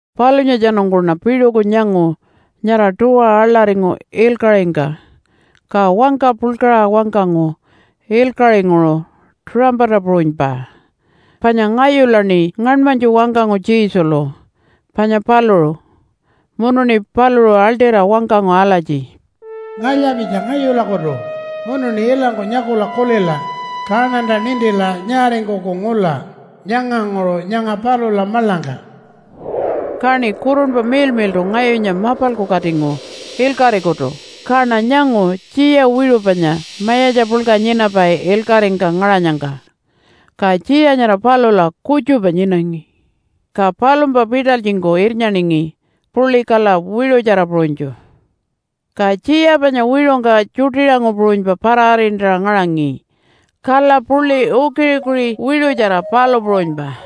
Palunyatjanungkuṉa piṟuku nyangu nyara tuwa aḻaringu ilkaṟingka. Ka wangka puḻkaṟa wangkangu ilkaṟinguṟu tuṟampata puṟunypa, panya ngayulaṉi ngaṉmanytju wangkangu Jesulu, panya paluṟu. Munuṉi paluṟu aḻṯira wangkangu alatji, “Ngalya-pitja ngayulakutu munuṉi ilangku nyakula kulila, kaṉanta nintila nyaaringkuku ngula nyanganguṟu nyanga palula maḻangka.” Kaṉi Kurunpa Miḻmiḻṯu ngayunya mapalku katingu ilkaṟikutu, kaṉa nyangu tjiya wiṟu panya mayatja puḻka nyinapai ilkaṟingka ngaṟanyangka. Ka tjiya nyara palula kutjupa nyinangi. Ka palumpa pitalytjingku irnyaningi puḻi kala wiṟutjara puṟunytju. Ka tjiya panya wiṟungka tjuṯiṟangu puṟunypa para-arintaṟa ngaṟangi kala puḻi ukiṟi-ukiṟi wiṟutjara palu puṟunypa.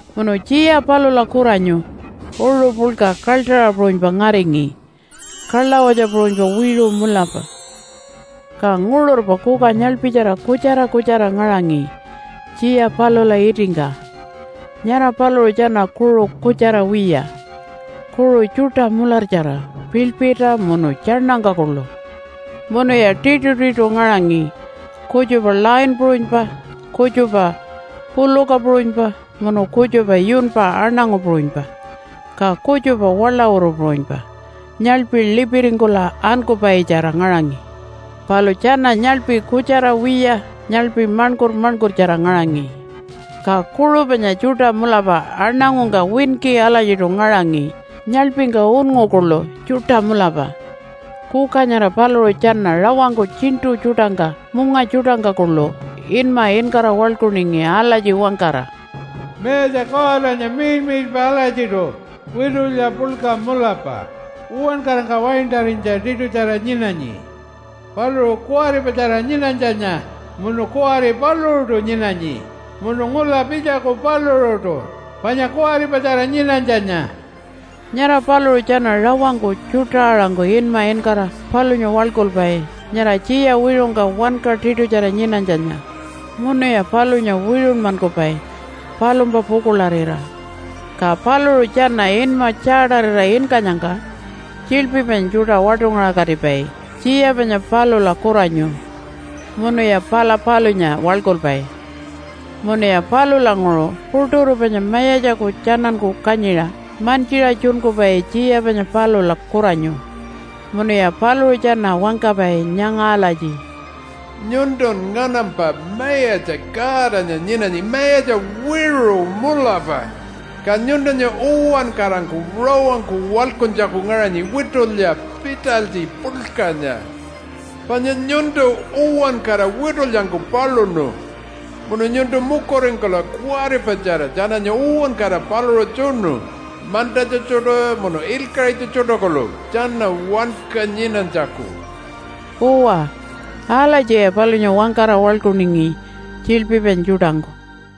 Munu tjiya palula kuranyu uṟu puḻka kaḻṯaṟa puṟunypa ngaringi kalawatja puṟunypa wiṟu mulapa. Ka nguṟurpa kuka nyaḻpitjara kutjara kutjara ngaṟangi tjiya palula itingka. Nyara paluṟu tjana kuṟu kutjara wiya, kuṟu tjuṯa mulartjara piḻpirta munu tjaṉangka kuḻu. Munuya tiṯutiṯu ngaṟangi, kutjupa lion puṟunypa, kutjupa puluka puṟunypa, munu kutjupa yunpa aṉangu puṟunypa, ka kutjupa waḻawuru puṟunypa nyaḻpi lipiringkula ankupaitjara ngaṟangi. Palu tjana nyaḻpi kutjara wiya nyaḻpi maṉkur-maṉkurtjara ngaṟangi, ka kuṟu panya tjuṯa mulapa aṉangungka winki alatjiṯu ngaṟangi, nyaḻpingka unngu kuḻu tjuṯa mulapa. Kuka nyara paluṟu tjana rawangku tjiṉṯu tjuṯangka munga tjuṯangka kuḻu inma inkara waḻkuningi alatji wangkara, “Mayatja Godanya miḻmiḻpa alatjiṯu, witulya puḻka mulapa uwankarangka waintarinytja tiṯutjara nyinanyi. Paluṟu kuwaripatjara nyinanytjanya, munu kuwari paluṟuṯu nyinanyi, munu ngula pitjaku paluṟuṯu panya kuwaripatjara nyinanytjanya.” Nyara paluṟu tjana rawangku tjuṯa-aṟangku inma inkara palunya waḻkulpai nyara tjiya wiṟungka wanka tiṯutjara nyinanytjanya, munuya palunya wiṟunmankupai palumpa pukuḻarira. Ka paluṟu tjana inma tjaatarira inkanyangka tjiḻpi panya tjuṯa waṯungaṟakatipai tjiya panya palula kuranyu munuya pala palunya waḻkulpai. Munuya palulanguṟu puṯuru panya mayatjaku tjananku kanyiṟa mantjiṟa tjunkupai tjiya panya palula kuranyu munuya paluṟu tjana wangkapai nyanga alatji, “Nyuntun nganampa Mayatja Godanya nyinanyi mayatja wiṟu mulapa, ka nyuntunya uwankarangku rawangku waḻkuntjaku ngaṟanyi witulya pitalytji puḻkanya. Panya nyuntu uwankara witulyangku paluṉu. Munun nyuntu mukuringkula kuwaripatjara tjananya uwankara paluṟa tjunu mantatja tjuṯa munu ilkaṟitja tjuṯa kuḻu tjana wanka nyinanytjaku.” Uwa, alatjiya palunya wangkara waḻkuningi tjiḻpi panya tjuṯangku.